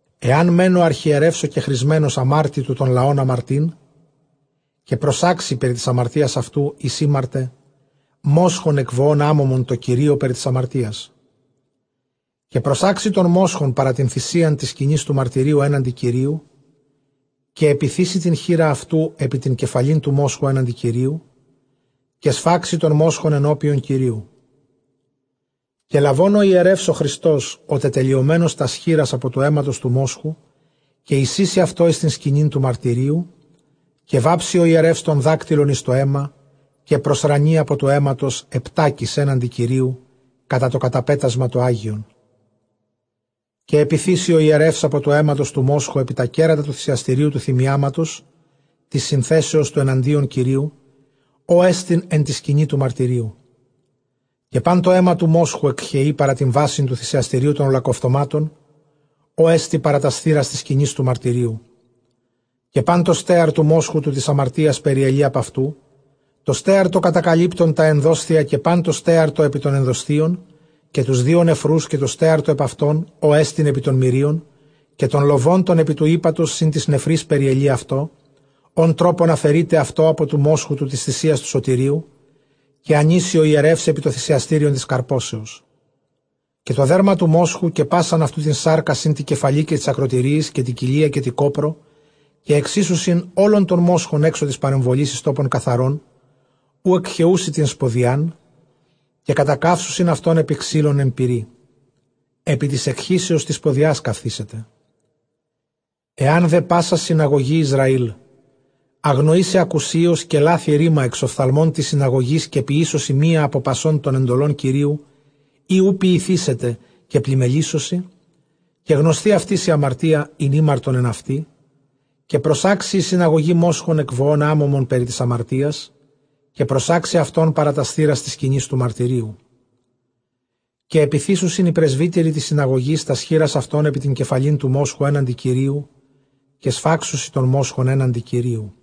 Ἐὰν μὲν ὁ ἀρχιερεὺς ὁ κεχρισμένος ἁμάρτῃ τοῦ τὸν λαὸν ἁμαρτεῖν, καὶ προσάξει περὶ τῆς ἁμαρτίας αὐτοῦ, ἧς ἥμαρτε, μόσχον ἐκ βοῶν ἄμωμον τῷ Κυρίῳ περὶ τῆς ἁμαρτίας. Καὶ προσάξει τὸν μόσχον παρὰ τὴν θύραν τῆς σκηνῆς τοῦ μαρτυρίου ἔναντι Κυρίου, καὶ ἐπιθήσει τὴν χεῖρα αὐτοῦ ἐπὶ τὴν κεφαλὴν τοῦ μόσχου ἔναντι Κυρίου, καὶ σφάξει τὸν μόσχον ἐνώπιον Κυρίου. Καὶ λαβὼν ὁ ἱερεὺς ὁ χριστὸς ὁ τετελειωμένος τὰς χεῖρας ἀπὸ τοῦ αἵματος τοῦ μόσχου, καὶ εἰσοίσει αὐτὸ εἰς τὴν σκηνὴν τοῦ μαρτυρίου. Καὶ βάψει ὁ ἱερεὺς τὸν δάκτυλον εἰς τὸ αἷμα, καὶ προσρανεῖ ἀπὸ τοῦ αἵματος ἑπτάκις ἔναντι Κυρίου, κατὰ τὸ καταπέτασμα τὸ ἅγιον. Καὶ ἐπιθήσει ὁ ἱερεὺς ἀπὸ τοῦ αἵματος τοῦ μόσχου ἐπὶ τὰ κέρατα τοῦ θυσιαστηρίου τοῦ θυμιάματος τῆς συνθέσεως τοῦ ἐναντίον Κυρίου, ὅ ἐστιν ἐν τῇ σκηνῇ τοῦ μαρτυρίου· καὶ πᾶν τὸ αἷμα τοῦ μόσχου ἐκχεεῖ παρὰ τὴν βάσιν τοῦ θυσιαστηρίου τῶν ὁλοκαυτωμάτων, ὅ ἐστι παρὰ τὰς θύρας τῆς σκηνῆς τοῦ μαρτυρίου. Καὶ πὰν τὸ στέαρ τοῦ μόσχου τοῦ τῆς ἁμαρτίας περιελεῖ ἀπʼ αὐτοῦ, τὸ στέαρ τὸ κατακαλύπτον τὰ ἐνδόσθια, καὶ πᾶν τὸ στέαρ τὸ ἐπὶ τῶν ἐνδοσθίων, καὶ τοὺς δύο νεφροὺς, καὶ τὸ στέαρ τὸ ἐπʼ αὐτῶν, ὅ ἐστιν ἐπὶ τῶν μηρίων, καὶ τὸν λοβὸν τὸν ἐπὶ τοῦ ἥπατος σὺν τοῖς νεφροῖς περιελεῖ αὐτό, ὃν τρόπον ἀφαιρεῖται αὐτὸ ἀπὸ τοῦ μόσχου τοῦ τῆς θυσίας τοῦ σωτηρίου, καὶ ἀνοίσει ὁ ἱερεὺς ἐπὶ τὸ θυσιαστήριον τῆς καρπώσεως. Καὶ τὸ δέρμα τοῦ μόσχου, καὶ πᾶσαν αὐτοῦ τὴν σάρκα σὺν τῇ κεφαλῇ καὶ τοῖς ἀκρωτηρίοις καὶ τῇ κοιλίᾳ καὶ τῇ κόπρῳ· καὶ ἐξοίσουσιν ὅλον τὸν μόσχον ἔξω τῆς παρεμβολῆς εἰς τόπον καθαρὸν, οὗ ἐκχεοῦσι τὴν σποδιὰν, καὶ κατακαύσουσιν αὐτὸν ἐπὶ ξύλων ἐν πυρί· ἐπὶ τῆς ἐκχύσεως τῆς σποδιᾶς καυθήσεται. Ἐὰν δὲ πᾶσα συναγωγὴ Ἰσραὴλ ἀγνοήσῃ ἀκουσίως, καὶ λάθῃ ῥῆμα ἐξ ὀφθαλμῶν τῆς συναγωγῆς, καὶ ποιήσωσι μίαν ἀπὸ πασῶν τῶν ἐντολῶν Κυρίου, ἣ οὐ ποιηθήσεται, καὶ πλήμμελήσωσι, καὶ γνωσθῇ αὐτοῖς ἡ ἁμαρτία, ἣν ἥμαρτον ἐν αὐτῇ, καὶ προσάξει ἡ συναγωγὴ μόσχον ἐκ βοῶν ἄμωμον περὶ τῆς ἁμαρτίας, καὶ προσάξει αὐτὸν παρὰ τὰς θύρας τῆς σκηνῆς τοῦ μαρτυρίου. Καὶ ἐπιθήσουσιν οἱ πρεσβύτεροι τῆς συναγωγῆς τὰς χείρας αὐτῶν ἐπὶ τὴν κεφαλὴν τοῦ μόσχου ἔναντι Κυρίου, καὶ σφάξουσιν τὸν μόσχον ἔναντι Κυρίου.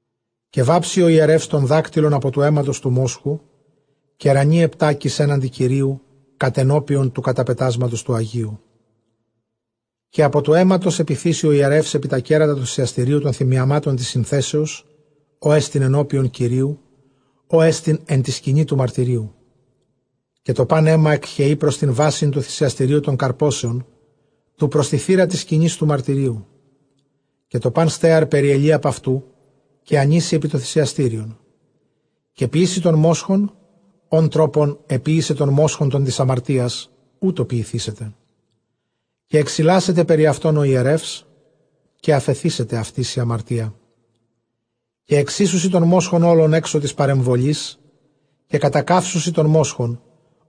Καὶ βάψει ὁ ἱερεὺς τὸν δάκτυλον ἀπὸ τοῦ αἵματος τοῦ μόσχου, καὶ ῥανεῖ ἑπτάκις ἔναντι Κυρίου, κατενώπιον τοῦ καταπετάσματος τοῦ ἁγίου. Καὶ ἀπὸ τοῦ αἵματος ἐπιθήσει ὁ ἱερεὺς ἐπὶ τὰ κέρατα τοῦ θυσιαστηρίου τῶν θυμιαμάτων τῆς συνθέσεως, ὅ ἐστιν ἐνώπιον Κυρίου, ὅ ἐστιν ἐν τῇ σκηνῇ τοῦ μαρτυρίου· καὶ τὸ πᾶν αἷμα ἐκχεεῖ πρὸς τὴν βάσιν τοῦ θυσιαστηρίου τῶν καρπώσεων, τοῦ πρὸς τῇ θύρᾳ τῆς σκηνῆς τοῦ μαρτυρίου. Καὶ τὸ πᾶν στέαρ περιελεῖ ἀπʼ αὐτοῦ, καὶ ἀνοίσει ἐπὶ τὸ θυσιαστήριον. Καὶ ποιήσει τὸν μόσχον, ὃν τρόπον ἐποίησε τὸν μόσχον τὸν τῆς ἁμαρτίας, οὕτω ποιηθήσεται· καὶ ἐξιλάσεται περὶ αὐτῶν ὁ ἱερεὺς, καὶ ἀφεθήσεται αὐτοῖς ἡ ἁμαρτία. Καὶ ἐξοίσουσι τὸν μόσχον ὅλον ἔξω τῆς παρεμβολῆς, καὶ κατακαύσουσι τὸν μόσχον,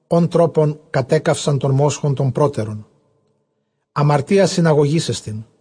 ὃν τρόπον κατέκαυσαν τὸν μόσχον τὸν πρότερον· ἁμαρτία συναγωγῆς ἐστιν.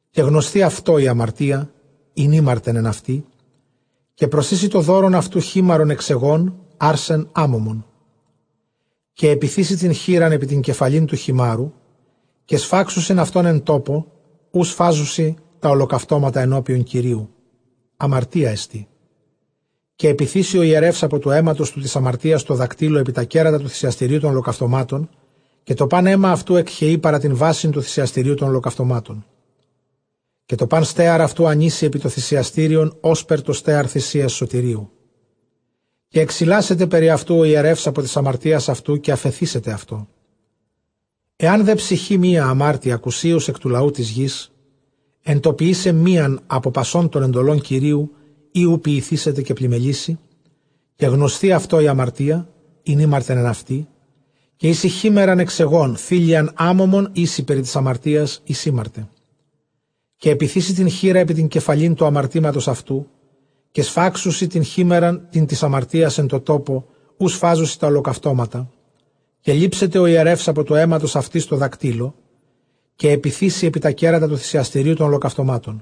καὶ γνωσθῇ αὐτῷ ἡ ἁμαρτία, ἣν ἥμαρτεν ἐν αὐτῇ, καὶ προσοίσει τὸ δῶρον αὐτοῦ χίμαρον ἐξ αἰγῶν, ἄρσεν ἄμωμον. Καὶ ἐπιθήσει τὴν χεῖρα ἐπὶ τὴν κεφαλὴν τοῦ χιμάρου· καὶ σφάξουσιν αὐτὸν ἐν τόπῳ οὗ σφάζουσι τὰ ὁλοκαυτώματα ἐνώπιον Κυρίου· ἁμαρτία ἐστί. Καὶ ἐπιθήσει ὁ ἱερεὺς ἀπὸ τοῦ αἵματος τοῦ τῆς ἁμαρτίας τῷ δακτύλῳ ἐπὶ τὰ κέρατα τοῦ θυσιαστηρίου τῶν ὁλοκαυτωμάτων· καὶ τὸ πᾶν αἷμα αὐτοῦ ἐκχεεῖ παρὰ τὴν βάσιν τοῦ θυσιαστηρίου τῶν ὁλοκαυτωμάτων. Καὶ τὸ πᾶν στέαρ αὐτοῦ ἀνοίσει ἐπὶ τὸ θυσιαστήριον, ὥσπερ τὸ στέαρ θυσίας σωτηρίου· καὶ ἐξιλάσεται περὶ αὐτοῦ ὁ ἱερεὺς ἀπὸ τῆς ἁμαρτίας αὐτοῦ, καὶ ἀφεθήσεται αὐτῷ. Ἐὰν δὲ ψυχὴ μία ἁμάρτῃ ἀκουσίως ἐκ τοῦ λαοῦ τῆς γῆς, ἐν τῷ ποιῆσαι μίαν ἀπὸ πασῶν τῶν ἐντολῶν Κυρίου, ἣ οὐ ποιηθήσεται, καὶ πλημμελήσῃ· καὶ γνωσθῇ αὐτῷ ἡ ἁμαρτία, ἣν ἥμαρτεν ἐν αὐτῇ, καὶ οἴσει χίμαιραν ἐξ αἰγῶν, θήλειαν ἄμωμον οἴσει περὶ τῆς ἁμαρτίας, ἧς ἥμαρτε. Καὶ ἐπιθήσει τὴν χεῖρα ἐπὶ τὴν κεφαλὴν τοῦ ἁμαρτήματος αὐτοῦ· καὶ σφάξουσιν τὴν χίμαιραν τὴν τῆς ἁμαρτίας ἐν τῷ τόπῳ, οὗ σφάζουσι τὰ ὁλοκαυτώματα. Καὶ λήψεται ὁ ἱερεὺς ἀπὸ τοῦ αἵματος αὐτῆς τῷ δακτύλῳ, καὶ ἐπιθήσει ἐπὶ τὰ κέρατα τοῦ θυσιαστηρίου τῶν ὁλοκαυτωμάτων·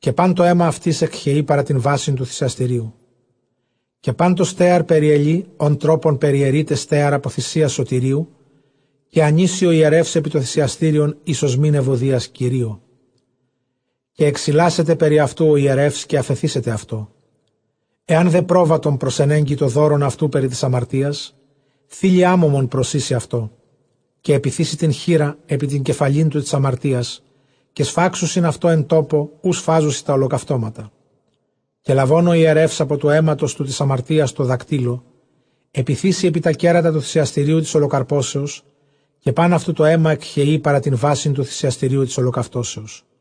καὶ πᾶν τὸ αἷμα αὐτῆς ἐκχεεῖ παρὰ τὴν βάσιν τοῦ θυσιαστηρίου. Καὶ πᾶν τὸ στέαρ περιελεῖ, ὃν τρόπον περιαιρεῖται στέαρ ἀπὸ θυσίας σωτηρίου· καὶ ἀνοίσει ὁ ἱερεὺς ἐπὶ τὸ θυσιαστήριον εἰς ὀσμὴν εὐωδίας Κυρίῳ· καὶ ἐξιλάσεται περὶ αὐτοῦ ὁ ἱερεὺς, καὶ ἀφεθήσεται αὐτῷ. Εὰν δὲ πρόβατον προσενέγκῃ τὸ δῶρον αὐτοῦ περὶ τῆς ἁμαρτίας, θῆλυ ἄμωμον προσοίσει αὐτό. Καὶ ἐπιθήσει τὴν χεῖρα ἐπὶ τῆν κεφαλὴν τοῦ τῆς ἁμαρτίας· καὶ σφάξουσιν αὐτὸ ἐν τόπῳ, οὗ σφάζουσι τὰ ὁλοκαυτώματα. Καὶ λαβὼν ὁ ἱερεὺς ἀπὸ τοῦ αἵματος τοῦ τῆς ἁμαρτίας τῷ δακτύλῳ, ἐπιθήσει ἐπὶ τὰ κέρατα τοῦ θυσιαστηρίου τῆς ὁλοκαρπώσεως· καὶ πᾶν αὐτοῦ τὸ αἷμα ἐκχεεῖ παρὰ τὴν βάσιν τοῦ θυσιαστηρίου τῆς ὁλοκαυτώσεως.